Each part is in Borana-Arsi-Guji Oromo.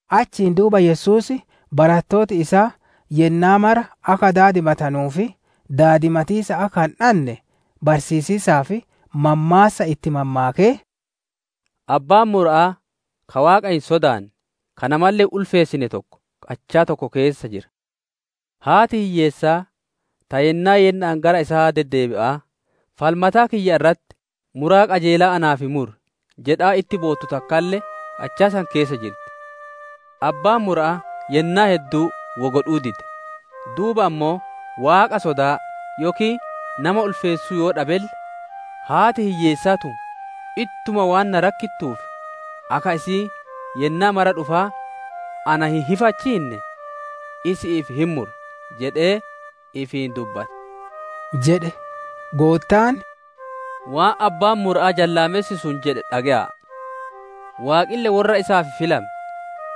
Achiin duuba Yesuus barattooti isaa yennaa mara akka daadimatanuu fi daadimatiisa akka hin dadhanne barsiisiisaaf mammaassa itti mammaakee: «Abbaan mura'aa ka Waaqa hin sodaanne, ka namalle hin ulfeessine tokko qachaa tokko keessa jira. Haati hiyyeessaa ta yennaa yenna'aan gara isaa deddeebi'aa, ‹Falmataa kiyya irratti muraa qajeelaa naaf muri› jedhaa itti boottu takkalle qachaa san keessa jirti. Abbaan mura'aa yennaa hedduu wo godhuu dide; duuba ammoo, ‹Waaqa sodaa yookiin nama ulfeessuu yoo dhabelle, haati hiyyeessaa tun ittuma waan na rakkittuuf, akka isiin yennaa mara dhufaa na hin hifachiinne isi'iif hin mura› jedhee ifiin dubbate» jedhe. Goottaan, «Waan abbaan mura'aa jallaamessi sun jedhe dhage'aa! Waaqille worra isaaf filame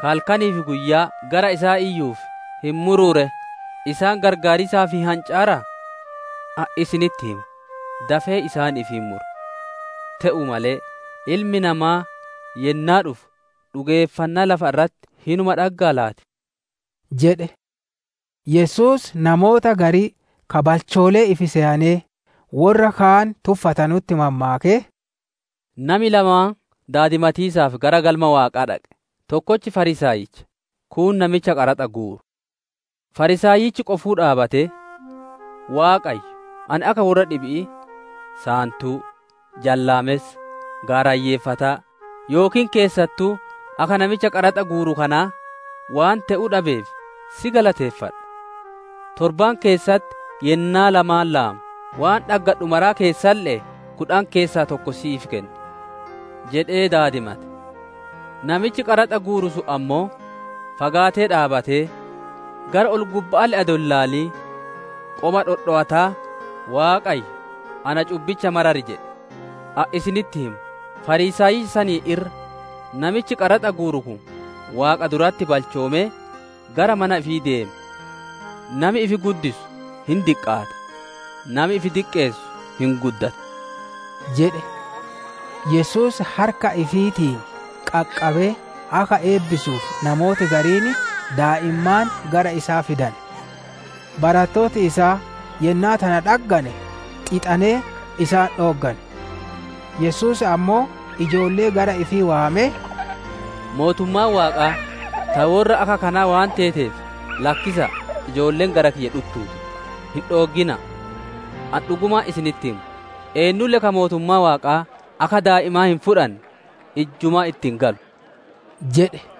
ka halkanii fi guyyaa gara isaa iyyuuf hin muruu ree? Isaan qarqaariisaaf hin hancaaraa? Ani isinitti hima, dafee isaaniif hin mura. Te'uu malee, Ilmi Namaa yennaa dhufu dhugeeffannaa lafa irratti hinuma dhaggaa laati?» jedhe. Yesuus namoota garii ka balchoolee ifi seyanee, worra kaan tuffatanutti, mammaakee: «Nami lamaan daadimatiisaaf gara Galma Waaqaa dhaqe: tokkochi Fariisaayicha, kuun namicha qaraxa guuru. Fariisaayichi qofuu dhaabbatee, ‹Waaqa, ani akka worra dhibi'ii: saantuu, jallaamessa, gaarayyeeffataa, yookiin keessattuu akka namicha qaraxa guuru kanaa, waan te'uu dhabeef si galateeffadha. Torbaan keessatti yennaa lamaan laama; waan dhaggadhu mara keessalle'ee kudhan keessaa tokko si'iif kenna› jedhee daadimate. Namichi qaraxa guuru sun ammoo, fagaatee dhaabbatee, gara ol-gubba'aalle adoo hin ilaalin, qoma dhodhowataa, ‹Waaqa, na cubbicha marari!› jedhe. Ani isinitti hima, Fariisaayicha saniin irra namichi qaraxa guuru kun Waaqa duratti balchoomee gara mana ifii deeme. Nami ifi guddisu hin diqqaata, nami ifi diqqeessu hin guddata» jedhe. Yesuus harka ifiitiin qaqqabee akka eebbisuuf namooti gariin daa'immaan gara isaa fidane. Barattooti isaa yennaa tana dhaggane, xixanee isaan dhooggane. Yesuus ammoo ijoollee gara ifii waamee, «Mootummaan Waaqaa ta worra akka kanaa waan teeteef, lakkisa'a, ijoolleen gara kiyya dhuttuu ti, hin dhooggina'a. Ani dhugumaan isinitti hima, eennulle ka mootummaa Waaqaa akka daa'imaa hin fudhanne, ijjumaa itti hin galu» jedhe.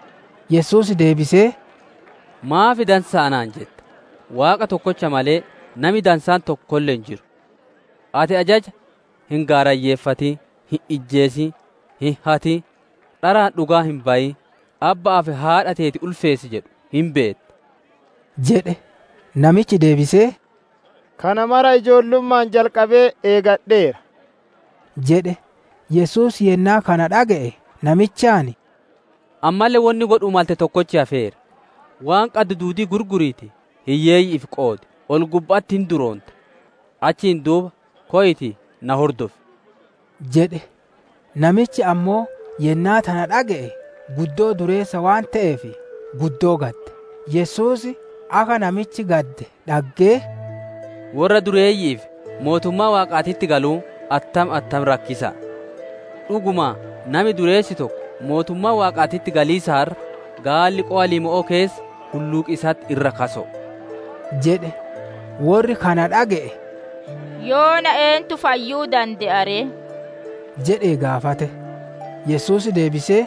Yesuus deebisee, «Maaf dansaa anaan jetta? Waaqa tokkocha malee, nami dansaan tokkolle hin jiru. Ati ajaja, ‹Hin gaarayyeeffatin, hin ijjeesin, hin hatin, dharaan dhugaa hin bayin, abba'aa fi haadha teetiif ulfinna kenni!› jedhu hin beetta» jedhe. Namichi deebisee, «Kana maraa ijoollumma'aan jalqabee eeggadheera» jedhe. Yesuus yennaa kana dhage'e namichaan, «Ammalle wonni godhuu malte tokkochi hafeera. Waan qaddu duudii gurguriitii hiyyeeyyi'iif qoodi, ol-gubba'atti hin duroonta; achiin duuba koyiitii na hordof!» jedhe. Namichi ammoo yennaa tana dhage'e, guddoo dureessa waan te'eef, guddoo gadde. Yesuus akka namichi gadde dhaggee, «Worra dureeyyi'iif mootummaa Waaqaatitti galuun attam attam rakkisa'a! Dhugumaan, nami dureessi tokko mootummaa Waaqaatitti galiisaan irra, gaalli qowa limmo'oo keessa hulluuqiisatti irra kaso'o» jedhe. Worri kana dhage'e, «Yoona eentu fayyuu dande'a ree?» jedhee gaafate. Yesuus deebisee,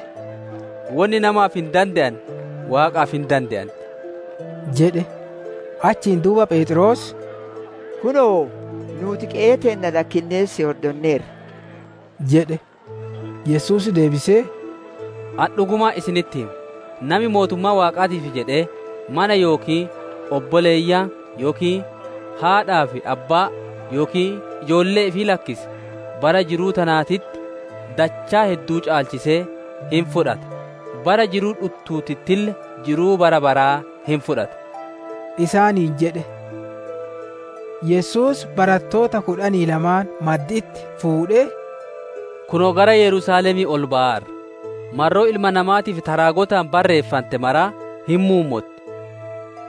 «Wonni namaaf hin dande'ane Waaqaaf hin dande'anti» jedhe. Achiin duuba Pheexroos, «Kunoo, nuuti qe'ee teenna lakkinnee si hordonneerra» jedhe. Yesuus deebisee, «Ani dhugumaan isinitti hima, nami mootummaa Waaqaatiif jedhee, mana yookiin obboleeyyan yookiin haadhaa fi abbaa yookiin ijoollee ifii lakkise, bara jiruu tanaatitti dachaa hedduu caalchisee hin fudhata; bara jiruu dhuttuutittille jiru bara baraa hin fudhata» isaaniin jedhe. Yesuus barattoota kudhanii lamaan maddi'itti fuudhee, «Kunoo gara Yerusaalemii ol bayaarra, marroo Ilma Namaatiif ta raagotaan barreeffante maraa hin muummotti.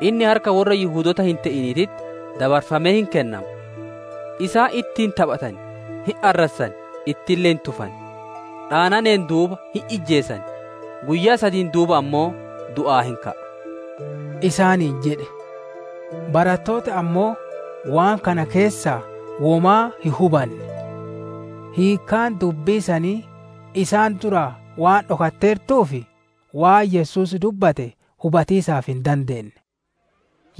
Inni harka worra Yihudoota hin te'iniititti dabarfamee hin kennama. Isaan itti hin taphatan, hin arrassan, ittille hin tufan. Dhaananeen duuba hin ijjeesan, guyyaa sadiin duuba ammoo du'aa hin ka'a» isaaniin jedhe. Barattooti ammoo waan kana keessaa womaa hin hubanne. Hiikkaan dubbii sanii isaan duraa waan dhokatteertuuf waan Yesuus dubbate hubatiisaaf hin dandeenne.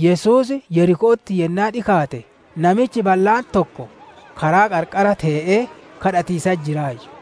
Yesuus Yeriko'otti yennaa dhikaate, namichi ballaan tokko karaa qarqara tee'ee kadhatiisatti jiraayyu.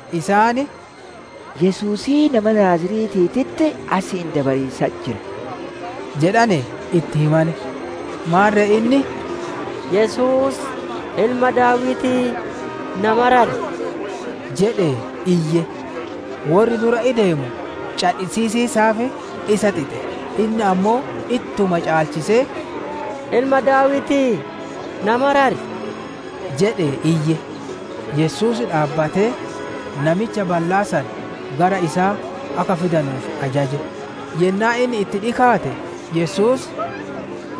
Isaan, «Yesuusii nama Naaziretiititti asiin dabariisatti jira» jedhane itti himane. Maarre inni, «Yesuus, Ilma Daawitii na marari!» jedhee iyye. Worri dura ideemu cadhisiisiisaaf isa xixe; inni ammoo ittuma caalchisee, «Ilma Daawitii, na marari!» jedhee iyye. Yesuus dhaabbatee, namicha ballaa san gara isaa akka fidanuuf ajaje. Yennaa inni itti dhikaate, Yesuus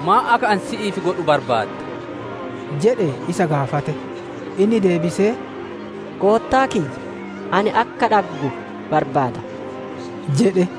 «Maan akka ani si'iif godhu barbaadda?» jedhee isa gaafate. Inni deebisee, «Goottaa kiyya, ani akka dhaggu barbaada» jedhe.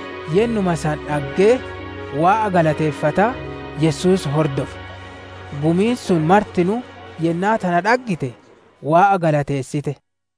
Yennuma san dhaggee, Waaqa galateeffataa Yesuus hordofe. Gumiin sun martinuu yennaa tana dhaggite, Waaqa galateessite.